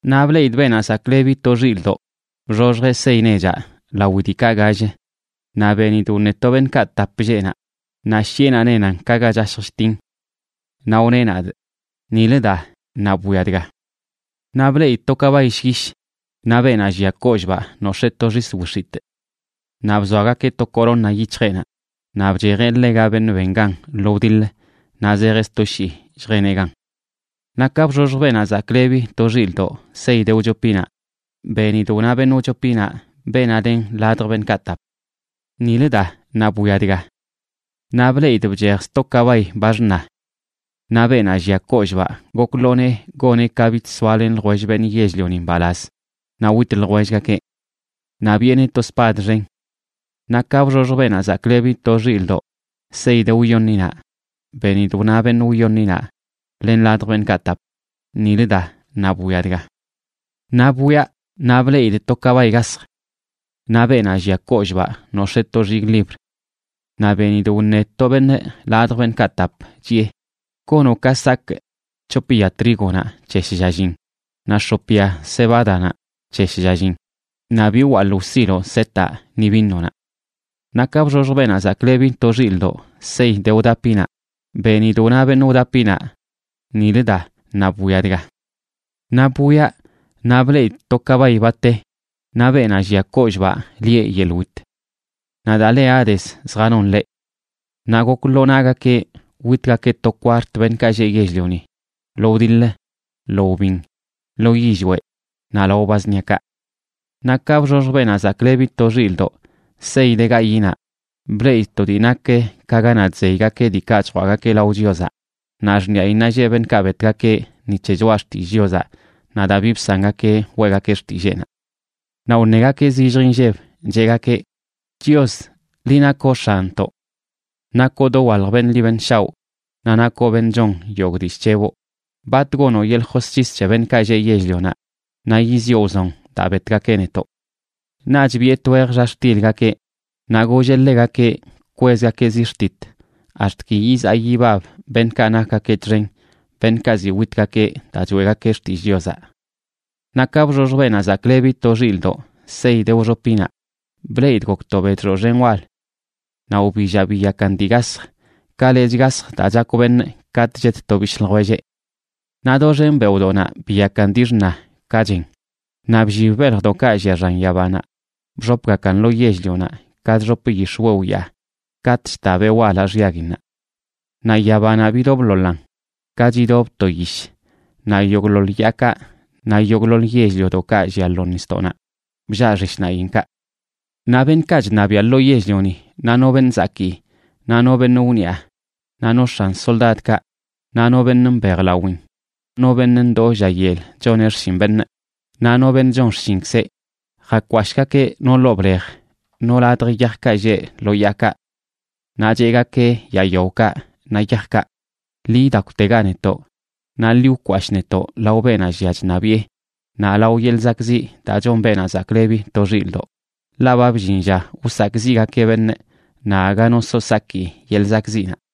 Naꞌ bleꞌidꞌ Beenaꞌ Zaklebi to Xilꞌdoꞌ bxoxjeꞌ sey nechaꞌ lawi diikaꞌ gall, naꞌ benidꞌ wṉe to beṉꞌkaꞌ tap lleꞌ naꞌ, naꞌ shiꞌenaꞌ nenan ka ga chashj chtin. Naꞌ wneꞌ nadꞌ: ―Nilə da, naꞌ bwia dga. Naꞌ bleꞌidꞌ to kabay llyish, naꞌ beenaꞌ llia kollꞌbaꞌ nox̱ee to xis wix̱itꞌ. Naꞌ bzoagakeꞌ to corona yic̱hjeꞌnaꞌ, naꞌ bchejeꞌ ḻega beṉꞌ ben gan lo wdiḻ naꞌ zejeꞌ sto shii lljeneꞌ gan. Naꞌ ka bxoxj Beenaꞌ Zaklebi to Xilꞌdoꞌ sey de wchopinaꞌ, benidꞌ wna beṉꞌ wchopinaꞌ, beenaꞌ len ladj beṉꞌkaꞌ tap: ―Nilə da, naꞌ bwia dga. Naꞌ bleꞌidꞌ bchej sto kabay, ba xṉa. Naꞌ beenaꞌ llia kollꞌbaꞌ gok ḻoo nee goneꞌ ka bich soalen ljwell beṉꞌ yell-lioni mbalaz naꞌ wit ljwellgakeꞌ. Naꞌ biꞌeneꞌ to spad xen. Naꞌ ka bxoxj Beenaꞌ Zaklebi to Xilꞌdoꞌ sey de wyoṉinaꞌ, benidꞌ wna beṉꞌ wyoṉinaꞌ len ladj beṉꞌkaꞌ tap: ―Nilə da, naꞌ bwia dga. Naꞌ bwiaꞌ naꞌ bleꞌidꞌ to kabay gasj. Naꞌ beenaꞌ llia kollꞌbaꞌ nox̱ee to xigꞌlibr. Naꞌ benidꞌ wṉe to beṉꞌ ladj beṉꞌkaꞌ tap, chiꞌe: ―Gonoꞌ ka sakꞌ c̱hop ya trígonaꞌ c̱he shlla llin, naꞌ x̱op ya cebádanaꞌ c̱he shlla llin, naꞌ bi wwalꞌ wsiloꞌ setaꞌ ni vinonaꞌ. Naꞌ ka bxoxj Beenaꞌ Zaklebi to Xilꞌdoꞌ sey de wdapinaꞌ, benidꞌ wna beṉꞌ wdapinaꞌ: ―Nilə da, naꞌ bwia dga. Naꞌ bwiaꞌ, naꞌ bleꞌidꞌ to kabay, ba te, naꞌ beenaꞌ llia kollꞌbaꞌ lieꞌ Yeḻꞌ Wit. Naꞌ daa le Hadesa zjanon ḻeꞌ. Naꞌ gok lo nagakeꞌ witgakeꞌ to kwart beṉꞌkaꞌ lleꞌ yell-lioni lo wdiḻ, lo wbin, lo yillweꞌ naꞌ lao ba zṉiakaꞌ. Naꞌ ka bxoxj Beenaꞌ Zaklebi to Xilꞌdoꞌ sey de gayiꞌnaꞌ, bleꞌidꞌ to dii nak ka ganaꞌ chzeygakeꞌ diikaꞌ chjwaꞌgakeꞌ lao Chiozaꞌ, naꞌ xṉiꞌayinnaꞌ lleꞌ beṉꞌkaꞌ betgakeꞌ ni c̱he choꞌa xtillꞌ Chiozaꞌ, naꞌ daa bi bsangakeꞌ weꞌgakeꞌ xtilleenaꞌ. Naꞌ wṉegakeꞌ zillj inlleb, cheꞌgakeꞌ: ―Chios, liꞌ nakoꞌ X̱anntoꞌ. Nakoꞌ dowalj beṉꞌ ḻi beṉꞌ shaoꞌ naꞌ nakoꞌ beṉꞌ chon yogꞌ dii chc̱heboꞌ, ¿bat gonoꞌ yeḻꞌ josc̱his c̱he beṉꞌkaꞌ lleꞌ yell-lionaꞌ naꞌ yiziꞌo wzon daa betgakeꞌ netoꞌ? Naꞌch biꞌe twej xa xtilgakeꞌ, naꞌ golleꞌ ḻegakeꞌ kwezgakeꞌ ziꞌ xtit ax̱t ki yizaa yibab beṉꞌkaꞌ nakgakeꞌ txen, beṉꞌkaꞌ ziꞌ witgakeꞌ daa choeꞌgakeꞌ xtillꞌ Chiozaꞌ. Naꞌ ka bxoxj Beenaꞌ Zaklebi to Xilꞌdoꞌ sey de wxopinaꞌ, bleꞌidꞌ gok to bedxoꞌ xen wal. Naꞌ wbillaꞌ biyakan dii gasj ka lechꞌ gasj daa chakw beṉꞌ katꞌ chet to bishꞌ ljwelleꞌ. Naꞌ doxen beoꞌdoꞌnaꞌ biyakan dii xṉa ka chen, naꞌ bllib beljdoꞌkaꞌ llia xan yabanaꞌ, bxopgakan lo yell-lionaꞌ ka chxop yix̱wew yaa katꞌ chta beꞌ walaꞌ xyaguinnaꞌ. Naꞌ yabanaꞌ bidobḻoḻan ka chidob to yish, naꞌ yogꞌḻoḻ yaakaꞌ naꞌ yogꞌḻoḻ yell-liodoꞌkaꞌ llia lo nisdoꞌnaꞌ bllaꞌ xishnaꞌinkaꞌ. Naꞌ beṉꞌkaꞌ chṉabiaꞌ lo yell-lioni, naꞌ no beṉꞌ zakii, naꞌ no beṉꞌ wniꞌa, naꞌ no x̱an soldadkaꞌ, naꞌ no beṉꞌ mbejlawin, no beṉꞌ ndoo lla yel choneꞌ xshin beṉꞌ naꞌ no beṉꞌ chon xshinkzeꞌ, jakwashꞌgakeꞌ no ḻoo blej, no ladj yajkaꞌ lleꞌ lo yaakaꞌ. Naꞌ cheꞌgakeꞌ yaa yaokaꞌ naꞌ yajkaꞌ: ―Ḻi idakwtega netoꞌ, naꞌ ḻi wkwashꞌ netoꞌ lao beenaꞌ llia chṉabiꞌe naꞌ lao yeḻꞌ zakꞌziꞌ daa chon Beenaꞌ Zaklebi to Xilꞌdoꞌ, ḻaꞌ ba bllin lla wsakꞌziꞌgakeꞌ beṉꞌ, naꞌ aga no so saki yeḻꞌ zakꞌziꞌnaꞌ.